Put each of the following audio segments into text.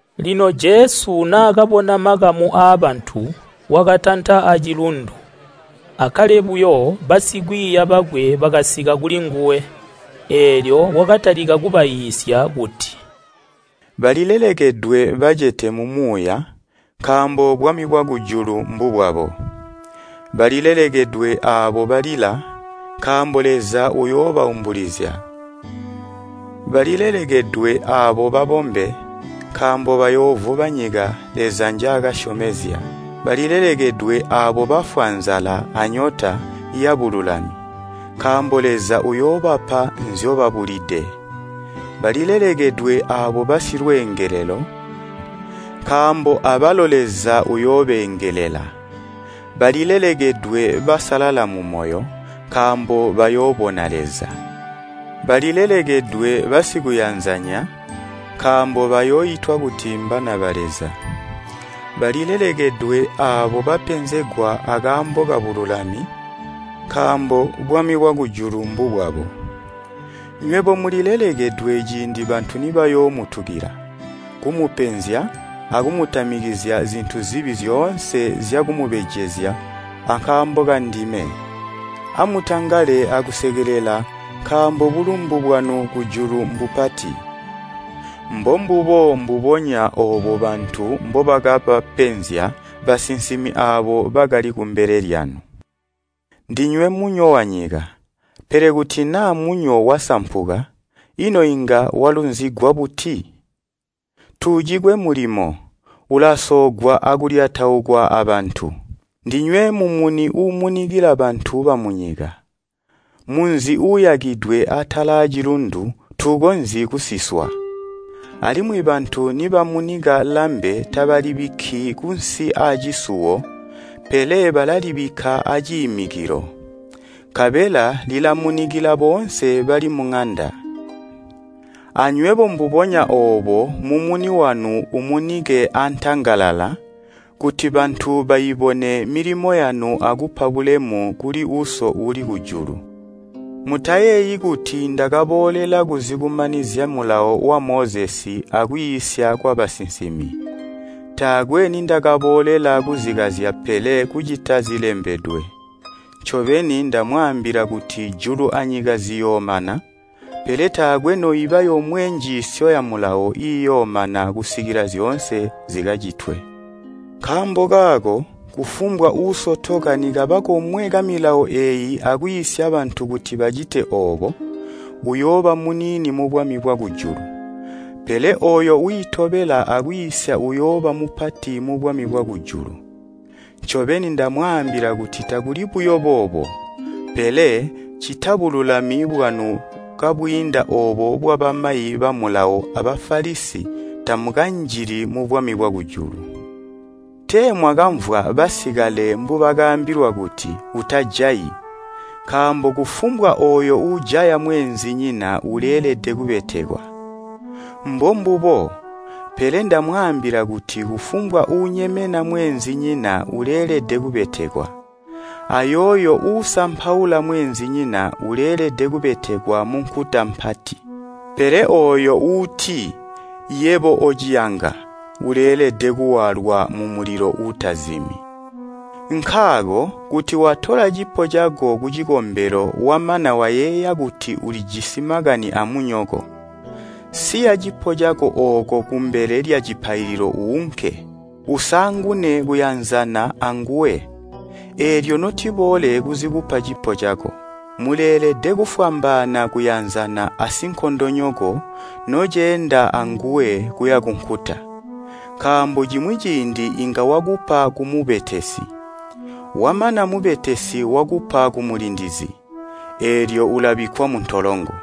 Lino Jesu naakabona makamu aabantu, wakatanta acilundu. Akkale buyo basikwiiya bakwe bakasika kulinguwe. Eelyo wakatalika kubaiisya kuti, “Balilelekedwe bacete mumuuya, nkaambo bwami bwakujulu mbubwabo. “Balilelekedwe aabo balila, nkaambo Leza uyoobaumbulizya. “Balilelekedwe aabo babombe, nkaambo bayoovuba nyika Leza njaakasyomezya. “Balilelekedwe aabo bafwa nzala anyota yabululami, nkaambo Leza uuyoobapa nzyobabula. “Balilelekedwe aabo basilweengelelo, nkaambo abalo Leza uyoobeengelela. “Balilelekedwe basalala mumoyo, nkaambo bayoobona Leza. “Balilelekedwe basikuyanzanya, nkaambo bayooitwa kuti mbana ba Leza. “Balilelekedwe aabo bapenzegwa akaambo kabululami, nkaambo bwami bwakujulu mbubwabo. “Nywebo mulilelekedwe ciindi bantu nibayoomutukila, kumupenzya akumutamikizya zintu zibi zyoonse zyakumubejezya ankaambo kandime. Amutangale akusekelela nkaambo bulumbu bwanu kujulu mbupati. Mbombubo mbubonya oobo bantu mbobakabapenzya basinsimi aabo bakali kumbele lyanu. “Ndinywe munyo wanyika, pele kuti naa munyo wasampuka, ino inga walunzigwa buti? Tuucikwe mulimo, ulasoogwa akulyataukwa abantu. “Ndinywe mumuni uumunikila bantu bamunyika. Munzi uuyakidwe atala aacilundu tuukonzyi kusiswa. Alimwi bantu nibamunika lambe tabalibikki kunsi aacisuwo pele balalibikka aciimikilo, nkabela lilamunikila boonse bali muŋanda. Anywebo mbubonya oobo mumuni wanu uumunike antangalala kuti bantu baibone milimo yanu akupa bulemu kuli Uso uuli kujulu. “Mutayeeyi kuti ndakaboolela kuzikumanizya Mulawo wa Mozesi akwiisya kwabasinsimi. Taakwe nindakaboolela kuzikazya pele kucita zilembedwe. Ncobeni ndamwaambila kuti julu anyika ziyoomana, pele taakwe noiba yomwe njiisyo ya Mulawo iiyoomana kusikila zyoonse zikacitwe. Nkaambo kaako kufumbwa uusotoka nikaba komwe kamilawo eeyi akwiisya bantu kuti bacite oobo, uyooba muniini mubwami bwakujulu. Pele ooyo wiitobela akwiisya uyooba mupati mubwami bwakujulu. Ncobeni ndamwaambila kuti takuli buyo boobo, pele, ccita bululami bwanu kabwiinda oobo bwabamayi ba Mulawo a Bafalisi tamukanjili mubwami bwakujulu. “Tee mwakamvwa basikale mbubakaambilwa kuti, ‘Utajayi, nkaambo kufumbwa ooyo uujaya mweenzinyina uleelede kubetekwa.’ Mbombubo, pele ndamwaambila kuti kufumbwa uunyemena mweenzinyina uleelede kubetekwa. Ayooyo uusampaula mweenzinyina uleelede kubetekwa munkuta mpati. Pele ooyo uuti, ‘Yebo ociyanga!’ Uleelede kuwaalwa mulilo uutazimi. Nkaako kuti watola cipo cako kucikombelo wamana wayeeya kuti ulijisi makani amunyoko, siya cipo cako ooko kumbele lyacipaililo uunke. Usaangune kuyanzana anguwe, eelyo notiboole kuzikupa cipo cako. “Muleelede kufwambaana kuyanzana asinkondonyoko noceenda anguwe kuya kunkuta. Nkaambo cimwi ciindi inga wakupa kumubetesi, wamana mubetesi wakupa kumulindizi, eelyo ulabikkwa muntolongo.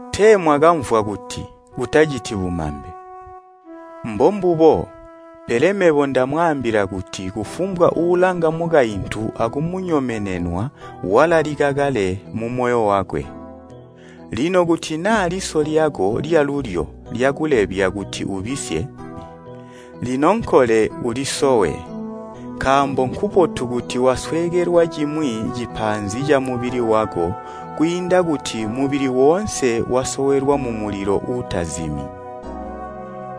“Tee mwakamvwa kuti, ‘Utaciti bumambe.’ Mbombubo, pele mebo ndamwaambila kuti kufumbwa uulanga mukaintu akumunyomenenwa walalika kale mumoyo wakwe. Lino kuti naa liso lyako lyalulyo lyakulebya kuti ubisye, linonkole ulisowe, nkaambo nkubotu kuti wasweekelwa cimwi cipaanzi camubili wako kwiinda kuti mubili woonse wasowelwa mumulilo uutazimi.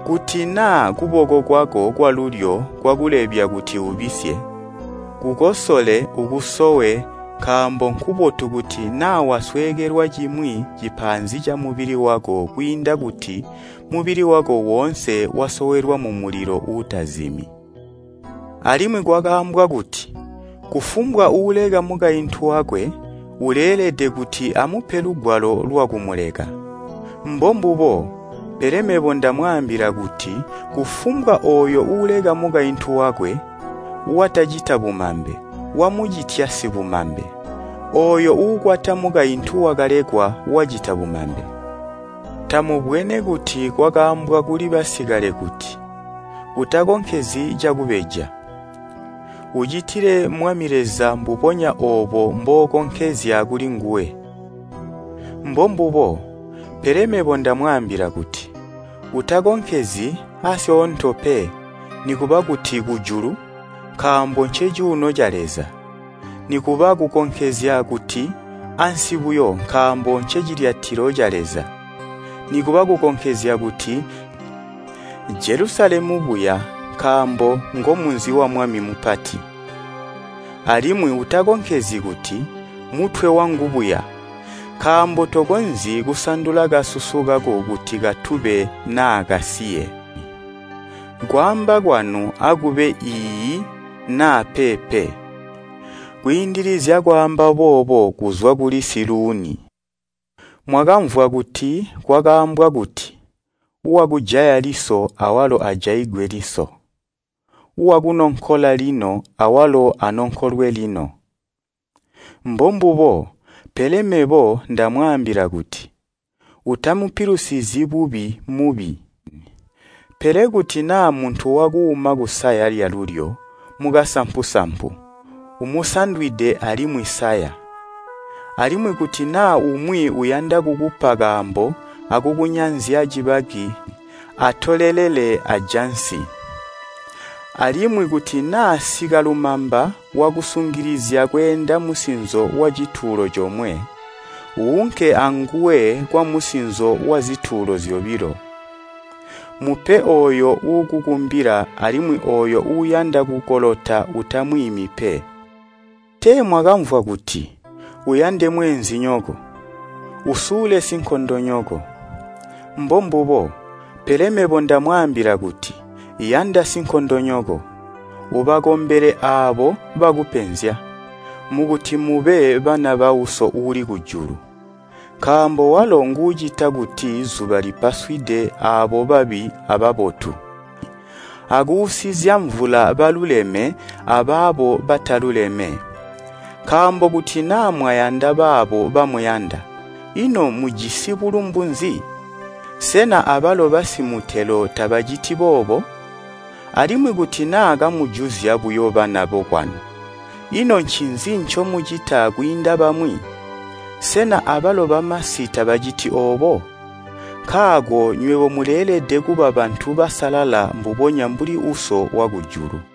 Kuti naa kuboko kwako kwalulyo kwakulebya kuti ubisye, kukosole ukusowe, nkaambo nkubotu kuti naa wasweekelwa cimwi cipaanzi camubili wako kwiinda kuti mubili wako woonse wasowelwa mumulilo uutazimi. “Alimwi kwakaambwa kuti, ‘Kufumbwa uuleka mukaintu wakwe, uleelede kuti amupe lugwalo lwakumuleka!’ Mbombubo, pele mebo ndamwaambila kuti kufumbwa ooyo uuleka mukaintu wakwe, watacita bumambe, wamucitya sibumambe, ooyo uukwata mukaintu wakalekwa wacita bumambe. “Tamubwene kuti kwakaambwa kuli basikale kuti, ‘Utakonkezyi cakubeja. Ucitile Mwami Leza mbubonya oobo mbookonkezya kulinguwe.’ Mbombubo, pele mebo ndamwaambila kuti, ‘Utakonkezyi aasyoonto pe, nikuba kuti kujulu,’ nkaambo ncecuuno ca Leza, nikuba kukonkezya kuti, ‘ansi buya!’ Nkaambo ncecilyatilo ca Leza, nikuba kukonkezya kuti, ‘Jelusalemu buya!’ Nkaambo ngomunzi wa Mwami mupati. Alimwi utakonkezyi kuti, ‘mutwe wangu buya!’ Nkaambo tokonzyi kusandula kasusu kako kuti katube naa kasiye. Kwaamba kwanu akube ‘Iiyi,’ naa ‘Peepe.’ Nkwiindilizya kwaamba boobo kuzwa kuli siluuni. “Mwakamvwa kuti kwakaambwa kuti, ‘Wakujaya liso awalo ajaigwe liso, wakunonkola lino awalo anonkolwe lino!’ Mbombubo, pele mebo ndamwaambila kuti, ‘Utamupilusizyi bubi mubi.’ Pele kuti naa muntu wakuuma kusaya lyalulyo mukasampu-sampu, umusandwide alimwi saya. Alimwi kuti naa umwi uyanda kukupa kaambo akukunyanzya cibaki atolelele ajansi. Alimwi kuti naa sikalumamba wakusungilizya kweenda musinzo wacitulo comwe, uunke aanguwe kwamusinzo wazitulo zyobilo. Mupe ooyo uukukumbila alimwi ooyo uuyanda kukolota utamwiimi pe. “Tee mwakamvwa kuti, ‘Uyande mweenzinyoko, usule sinkondonyoko?’ Mbombubo, pele mebo ndamwaambila kuti, ‘Yanda sinkondonyoko, ubakombele aabo bakupenzya, mukuti mube bana ba Uso uuli kujulu.’ Nkaambo walo nguucita kuti zuba lipaswide aabo babi ababotu, akuusizya mvula baluleme abaabo bataluleme. Nkaambo kuti naa mwayanda baabo bamuyanda, ino mujisi bulumbu nzi? Sena abalo bakunze tabaciti boobo? Alimwi kuti naa kamujuzya buyo bana bokwanu, ino ncinzi ncomucita kwiinda bamwi? Sena abalo bamasi tabaciti oobo? Nkaako nywebo muleelede kuba bantu basalala mbubonya mbuli Uso wakujulu.